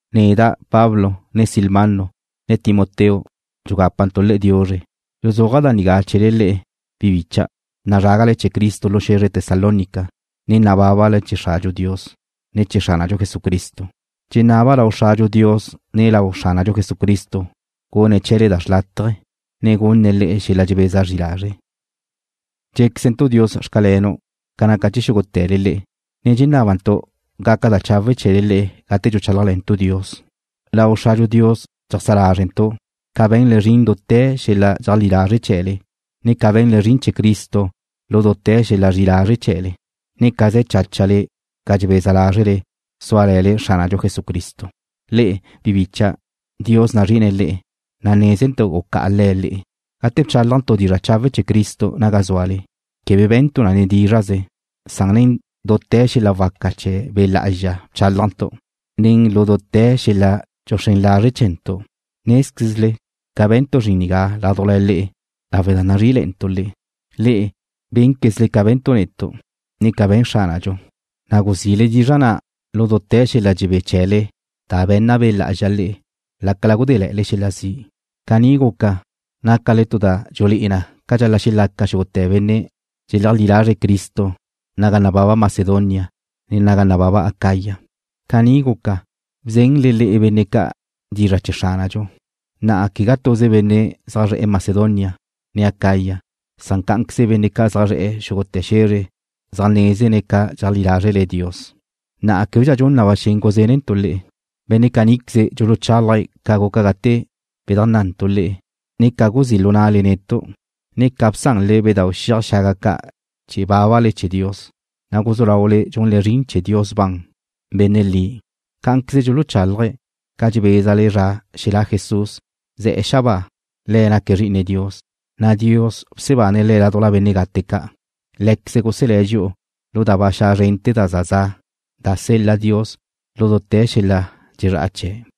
Neda', Pablo, ne Silvano, ne Timoteo dxugápantu' le'e diuzre. Dxuzúaja' da nigá chee̱le le'e, bi bicha', nazrágale chee̱ Cristo lu xe̱zre Tesalónica, ne nabábale chee̱ Xradxu Dios, ne chee̱ Xránadxu Jesucristo. Dxenaba' lau Xradxu Dios ne lau Xránadxu Jesucristo gune̱' chee̱le da xrlátaje, ne gunne̱' le'e xel-la dxebeza zri lazre'. Dxe̱quezentu' Dios xcalenu' ca naca chee̱ xúgute̱le le'e, ne dxenábantu' gaca da chawe' chee̱le le'e gate dxuchálajle̱ntu' Le̱'. Lau Xradxu Dios dxeajsá lázrentu' ca be̱nle zrin dute̱ lu xel-la dxeajlí lazre' chee̱le, ne ca be̱nle zrin chee̱ Cristo lu dute̱ xel-la zri'i lazre' chee̱le, ne ca ze̱ cháchale ca dxebeza lázrele súale̱le Xránadxu Jesucristo. Le'e, bi bicha', Dios nazri'ine̱' le'e, na' nézentu' gucá'a Le̱' le'e. Gate bchálajntu' dizra' chawe' chee̱ Cristo naga zúale, quebe be̱ntu' na nen dízra'ze, san nen dute̱ xel-la waca chee̱ Be' Lá'azxa bchálajntu', ne lu dute̱ xel-la dxuxrén lazre' chee̱ntu'. Nézquezle ca be̱ntu' zrin nigá ládujla le'e lawe' da nazrí'ile̱'e̱ntu' le'e. Le'e bé̱nquezle ca be̱ntu' netu', ne ca be̱n Xránadxu, na' guzile dizra' na' lu dute̱ xel-la dxebé chee̱le da be̱nna Be' Lá'azxa le'e, lácala gudéle̱'e̱le xel-la zi'. Caní guca, nácale tu da dxulé'e na ca dxal-la' xelaca xúgute̱ benne' dxeleajlí lazre̱' Cristo naga nababa Macedonia, ne naga nababa Acaya. Caní guca, bzenle le'e benne' ca' dizra' chee̱ Xránadxu. Na'a quegá tuze benne' zaj zre̱'e̱ Macedonia, ne Acaya, san cá'anqueze benne' ca' zaj zre̱'e̱ xúgute̱ xe̱zre zaj nézene̱' ca dxeajlí lázrele Dios, na' québedxa dxun na ba xen guzénentu' le̱'. Benne' caníqueze dxuluchálaje̱' ca guca gate bedajnná'antu' le'e ne ca guzí' lu na'le netu', ne ca bsanle bedau' xiaj xaga ca' chee̱ bábale chee̱ Dios, na' guzú laule dxunle zrin chee̱ Dios ban, Benne' li. Cá'anqueze dxuluchálaje̱' ca dxebézale zra xelá' Jesús, ze̱'e̱ xabáa. Le̱' naque̱' Zri'ine Dios, na' Dios bsebane̱' Le̱' ládujla benne' gate ca'. Lé̱queze̱' guselé̱' dxi'u lu da ba xa' zrente̱ da za za' da sel-la Dios lu dute̱ xel-la dxezrá'a chee̱'.